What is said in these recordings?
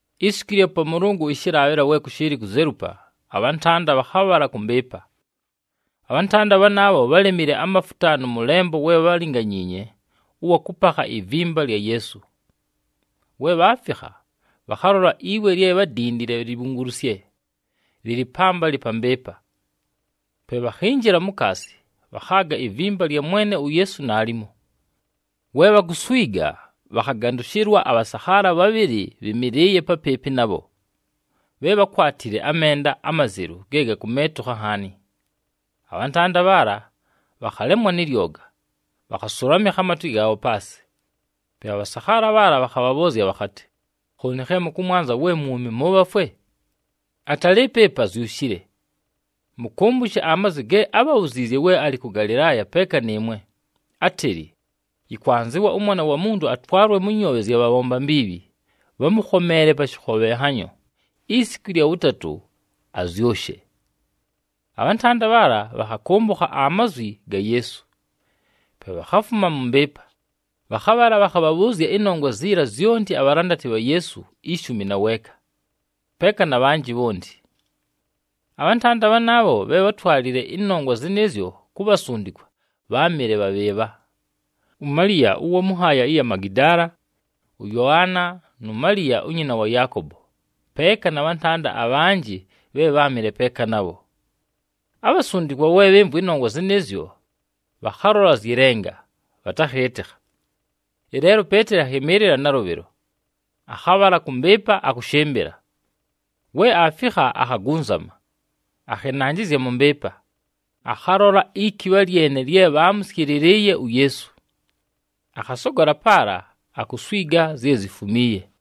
Isiku ɨlya Pamʉlʉngʉ ɨshɨlaabhɨla we kʉshɨɨlɨ kuzelupa, abhantanda bhakhabhala kʉ mbɨɨpa. Abhantanda bhanaabho, bhálemile amafuta nʉ mʉlembo we bhálinganyiinye ʉwa kʉpakha ivimba lya Yeesu. We bhaafikha, bhakhalola iwe lye bhádindile libhungulusye, lɨlɨ pambalɨ pa mbɨɨpa. Pe bhakhinjila mukaasi, bhakhaaga ivimba lya Mwene uYeesu naalimo. We bhakuswiga, bhakhagandʉshɨlwa abhasakhaala bhabhɨlɨ bhɨmɨlɨɨye papɨɨpɨ nabho, bhe bhákwatile amenda amazelu ge gakumeetukha nhaani. Abhantanda bhaala, bhakhalemwa nɨ lyoga, bhakhasʉlamɨkha amatwe gaabho paasɨ. Pe abhasakhaala bhaala bhakhabhabhʉʉzya bhakhatɨ, “Khooni khe mʉkʉmwanza we mwumi mʉ bhafwe? Atalɨɨpo ɨpa! Azyushile! Mʉkʉmbʉshe amazwi ge ábhabhuziizye we alɨ kʉ Galɨlaaya peeka nɨɨmwe, átɨlɨ, ‘Yɨkwanzɨwa ʉMwana wa Muntu atwalwe mʉ nyoobhe zya bhabhomba mbiibhi, bhamʉkhomeele pa shɨkhobhenhanyo, isiku ɨlya wʉtatʉ azyʉshe’!” Abhantanda bhaala, bhakhakʉmbʉkha amazwi ga Yeesu. Pe bhakhafuma mʉ mbɨɨpa, bhakhabhala bhakhabhabhʉʉzya ɨnongwa ziila zyonti abhalandati bha Yeesu ishumi na weeka, peeka na bhanjɨ bhonti. Abhantanda bhanaabho bhe bhátwalile ɨnongwa zɨnɨɨzyo ku bhasundikwa, bháamɨle bha bhɨɨbha: uMaliya ʉwa mʉ nhaaya ɨya mu Magidaala, ʉYoana, nu Maliya unyina wa Yaakobo, peeka na bhantanda abhanjɨ bhe bháamɨle peeka nabho. Abhasundikwa we bhɨmvwa ɨnongwa zɨnɨɨzyo, bhakhalola zyɨ lenga, bhatakhɨɨtɨkha. Ɨleelo uPeeteli akhɨmɨɨlɨla nalʉbhɨlo, akhabhala kʉ mbɨɨpa akʉshɨmbɨla. We aafikha, akhagunzama, akhɨnanjɨzya mʉ mbɨɨpa, akhalola ikibha lyene lye bhaamʉsyɨlɨlɨɨye uYeesu. Akhasogola paala, akuswiga zye zifumiiye.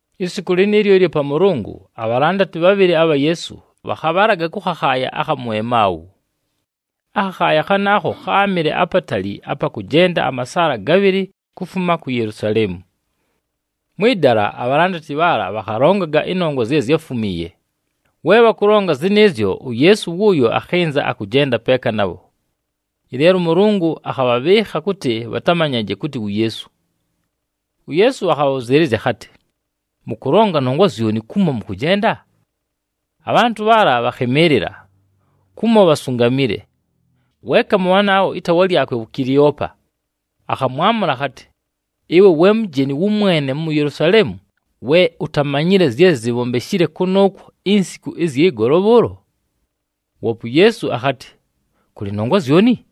Isiku lɨnɨɨlyo ɨlya Pamʉlʉngʉ, abhalandati bhabhɨlɨ abha Yeesu bhakhabhalaga kʉ khakhaaya akha mu Emau. Akhakhaaya khanaakho, kháamɨle apatali apa kʉjenda amasaala gabhɨlɨ kufuma ku Yelusaleemu. Mwɨ dala abhalandati bhaala bhakhalongaga ɨnongwa zye zyáfumiiye. We bhakʉlonga zɨnɨɨzyo, uYeesu wʉʉyo akhɨnza akʉjenda peeka nabho, ɨleelo ʉMʉlʉngʉ akhabhabhɨɨkha kʉtɨ bhatamanyaje kʉtɨ wu Yeesu. UYeesu akhabhabhʉzɨɨlɨzya akhatɨ, “Mʉkʉlonga nongwa zyoni kumo mʉkʉjenda?” Abhantʉ bhaala bhakhɨmɨɨlɨla, kumo bhasungamile. Weeka mʉ bhanaabho, ɨtaawa lyakwe áamɨle wu Kileopa, akhamwamʉla akhatɨ, “Ɨwe we mujeni wʉmwene mu Yelusaleemu, we utamanyile zye zibhombeshile kʉnʉʉkwo insiku ɨzyɨ golo bhʉʉlo!” Woope uYeesu akhatɨ, “Kʉlɨ nongwa zyoni?”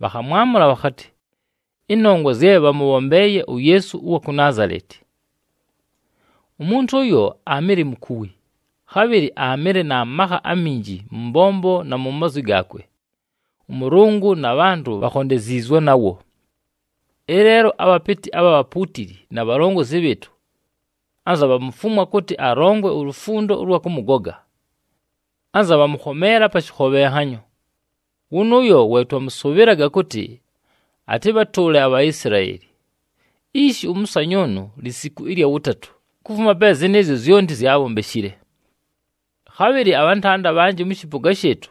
Bhakhamwamʉla bhakhatɨ, “Ɨnongwa zye bhamʉbhombeeye uYeesu ʉwa ku Naazaleti. Umuntu ʉyo aamɨle mukuwi, khabhɨlɨ aamɨle na makha aminji mʉ mbombo na mu mazwi gaakwe, ʉMʉlʉngʉ na bhantʉ bhaakhondeziizwe nawo. Ɨleelo, abhapɨtɨ abha bhapuutili, na bhalongozi bhɨɨtʉ, anza bhamufumwa kʉtɨ alongwe ulufundo ʉlwa kʉmʉgoga. Anza bhamʉkhomeela pa shɨkhobhenhanyo. Wʉnʉʉyo we twamʉsʉbhɨlaga kʉtɨ atɨbhatʉʉle aBhaisilaeli. Ishi, ʉmʉsanyʉʉnʉ lisiku ɨlya wʉtatʉ, kufuma pe zɨnɨɨzyo zyonti zyaabhombeshile. “Khabhɨlɨ abhantanda abhanjɨ mʉ shɨpʉga shɨɨtʉ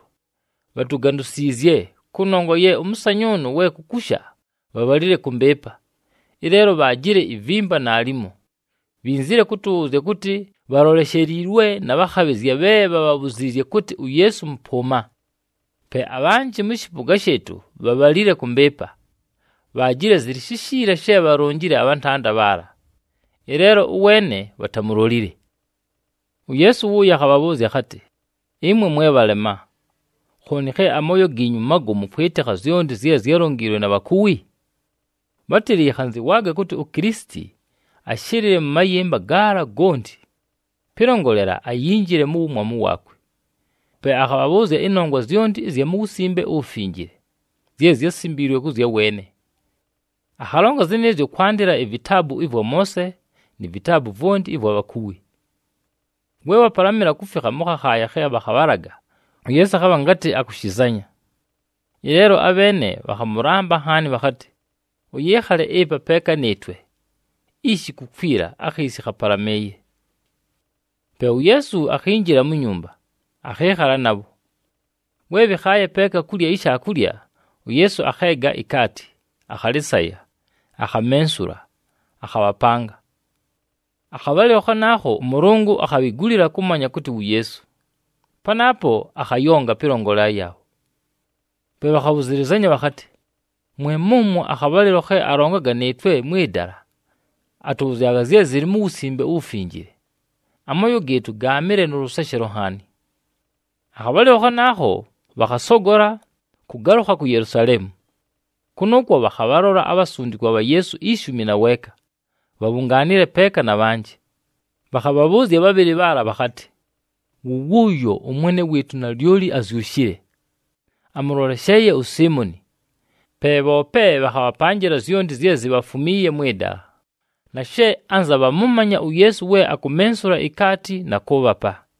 bhatugandusiizye, kʉnongwa ye ʉmʉsanyʉʉnʉ we kukusha, bhabhalile kʉ mbɨɨpa, ɨleelo bhaajile ivimba naalimo. Bhinzile kʉtʉbhʉʉzya kʉtɨ bhalolesheliilwe na bhakhabhɨzya bhe bhabhabhuziizye kʉtɨ uYeesu mʉpʉʉma. Pe abhanjɨ mʉ shɨpʉga shɨɨtʉ bhabhalile kʉ mbɨɨpa, bhaajile zɨlɨ shishiila she bhalonjile abhantanda bhaala, ɨleelo, ʉweene bhatamulolile.” UYeesu wʉʉyo akhabhabhʉʉzya akhatɨ, “Ɨmwe mwe bhalema! Khooni khe amooyo giinyu magomu kwɨtɨkha zyonti zye zyálonjiilwe na bhakuwi! Bhátɨlɨ yɨkhanzɨwaaga kʉtɨ uKilisiti ashɨlɨle mʉ mayɨmba gaala gonti, pɨlongolela ayinjile mu wumwamu waakwe.” Pe akhabhabhʉʉzya ɨnongwa zyonti ɨzya mu Wusimbe uWufinjile, zye zyásimbiilwe kʉ zya weene. Akhalonga zɨnɨɨzyo kwandɨla ivitaabu ɨvwa Moose ni vitaabu vwonti ɨvwa bhakuwi. We bhapalamɨla kufikha mʉ khakhaaya khe bhakhabhalaga, uYeesu akhabha ngatɨ akʉshɨzanya. Ɨleelo abheene bhakhamʉlamba nhaani bhakhatɨ, “Ʉyɨɨkhale ɨpa peeka nɨɨtwe! Ishi kukwila, akhiisi khapalamɨɨye.” Pe uYeesu akhinjila mu nyumba, akhɨɨkhala nabho. We bhɨkhaaye peeka kulya ishaakulya, uYeesu akheega ikaati, akhalɨsaya, akhamensula, akhabhapanga. Akhabhalɨlo khanaakho, ʉMʉlʉngʉ akhabhigulila kʉmanya kʉtɨ wu Yeesu, panaapo akhayonga pɨlongolela yaabho. Pe bhakhabhʉzɨlɨzanya bhakhatɨ, “Mwe mʉmwo akhabhalɨlo khe alongaga nɨɨtwe mwɨ dala, atʉbhʉzyaga zye zɨlɨ mu Wusimbe uWufinjile, amooyo gɨɨtʉ gaamɨle nʉ lʉseshelo nhaani!” Akhabhalɨlo khanaakho bhakhasogola, kʉgalʉkha ku Yelusaleemu. Kʉnʉʉkwo bhakhabhalola abhasundikwa bha Yeesu ishumi na weeka bhabhungaanile peeka na bhanjɨ, bhakhabhabhʉʉzya bhabhɨlɨ bhaala bhakhatɨ, “Wʉ wʉʉyo, ʉMwene wɨɨtʉ nalyoli azyushile! Amʉlolesheeye uSiimoni!” Pe bhoope bhakhabhapanjɨla zyonti zye zibhafumiiye mwɨ dala, na she anza bhamʉmanya uYeesu we akumensula ikaati na kʉʉbhapa.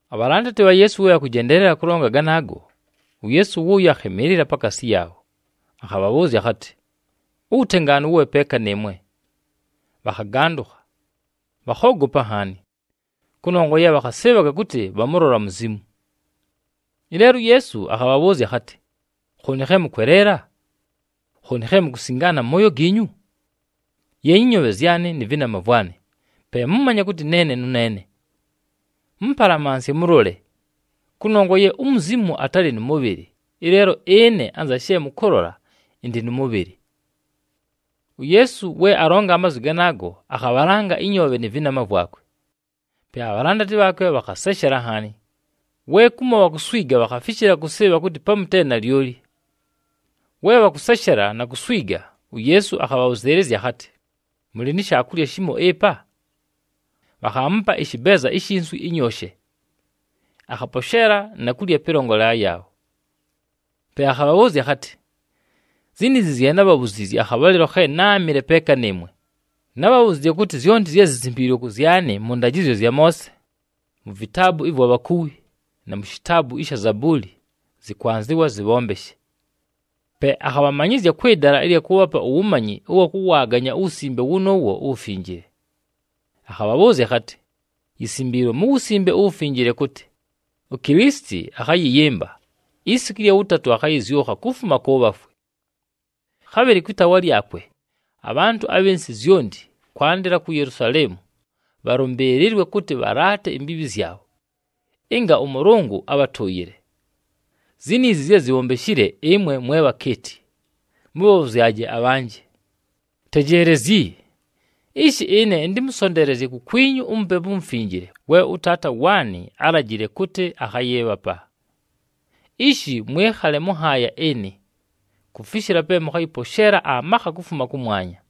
Abhalandati bha Yeesu we bhakʉjendeelela kʉlonga ganaago, uYeesu wʉʉyo akhɨmɨɨlɨla pakaasi yaabho. Akhabhabhʉʉzya akhatɨ, “Uwutengaanu wʉbhe peeka nɨɨmwe!” Bhakhagandʉkha, bhakhoogopa nhaani, kʉnongwa ye bhakhasɨɨbhaga kʉtɨ bhamʉlola muzimu. Ɨleelo, uYeesu akhabhabhʉʉzya akhatɨ, “Khooni khe mʉkweleela! Khooni khe mukusingaana mʉ mooyo giinyu! Yeenyi ɨnyoobhe zyanɨ nɨ vɨnama vwanɨ, pe mʉmanye kʉtɨ neene nʉneene. Mʉmpalamansye mʉlole, kʉnongwa ye umuzimu atalɨ nʉ mʉbhɨlɨ, ɨleelo ɨne anza she mʉkʉlola, ɨndɨ nʉ mʉbhɨlɨ.” UYeesu we alonga amazwi ganaago, akhabhalanga ɨnyoobhe nɨ vɨnama vwakwe. Pe abhalandati bhaakwe bhakhaseshela nhaani, we kumo bhakuswiga bhakhafishila kʉsɨɨbha kʉtɨ pamu te nalyoli! We bhakʉseshela na kuswiga, uYeesu akhabhabhʉzɨɨlɨzya akhatɨ, “Mʉlɨ ni shaakulya shimo ɨpa?” Bhakhaamupa ɨshɨbeeza ishi nswi ɨnyooshe. Akhaposheela na kulya pɨlongolela yaabho. Pe akhabhabhʉʉzya akhatɨ, “Ziniizi zye nábhabhuziizye akhabhalɨlo khe náamɨle peeka nɨɨmwe. Nábhabhuziizye kʉtɨ zyonti zye zisimbiilwe kʉ zyanɨ mʉ ndajɨzyo zya Moose, mu vitaabu ɨvwa bhakuwi, na mu shitaabu ɨsha Zabuuli, zɨkwanzɨwa zɨbhombeshe.” Pe akhabhamanyɨzya kwɨ dala ɨlya kʉʉbhapa uwumanyi ʉwa kʉwaaganya uWusimbe wʉnʉʉwo uWufinjile, akhabhabhʉʉzya akhatɨ, “Yisimbiilwe mu Wusimbe uWufinjile kʉtɨ, uKilisiti akhayɨyɨmba, isiku ɨlya wʉtatʉ, akhayɨzyʉkha kufuma kʉ bhafwe. Khabhɨlɨ kwɨ taawa lyakwe, abhantʉ abhɨ nsɨ zyonti, kwandɨla ku Yelusaleemu, bhalʉmbɨɨlɨlwe kʉtɨ bhalaate imbiibhi zyabho, ɨnga ʉMʉlʉngʉ abhatʉʉyɨle. Ziniizi zye zibhombeshile, ɨmwe mwe bhakeeti, mʉbhabhʉzyaje abhanjɨ. “Tejeelezyi! Ishi ɨne ɨntɨmʉsonteelezye kukwinyu uMupepu uMufinjile we ʉTaata waanɨ álajile kʉtɨ akhayɨɨbhapa. Ishi, mwɨkhale mʉ nhaaya ɨnɨ, kufishila pe mʉkhayɨposheela amakha kufuma kʉmwanya.”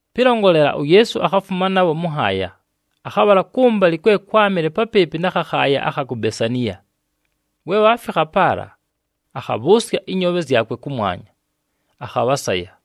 Pɨlongolela, uYeesu akhafuma nabho mʉ nhaaya, akhabhala kʉmbalɨ kwe kwámɨle papɨɨpɨ na khakhaaya akha ku Besaniya. We bhaafikha paala, akhabhʉʉsya ɨnyoobhe zyakwe kʉmwanya, akhabhasaya.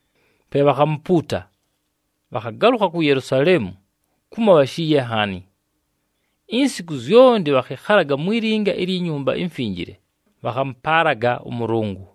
Pe bhakhamupuuta, bhakhagalʉkha ku Yelusaleemu, kumo bhashiiye nhaani. Insiku zyonti bhakhɨkhalaga mwi linga ilyi Nyumba iMfinjile, bhakhamʉpaalaga ʉMʉlʉngʉ.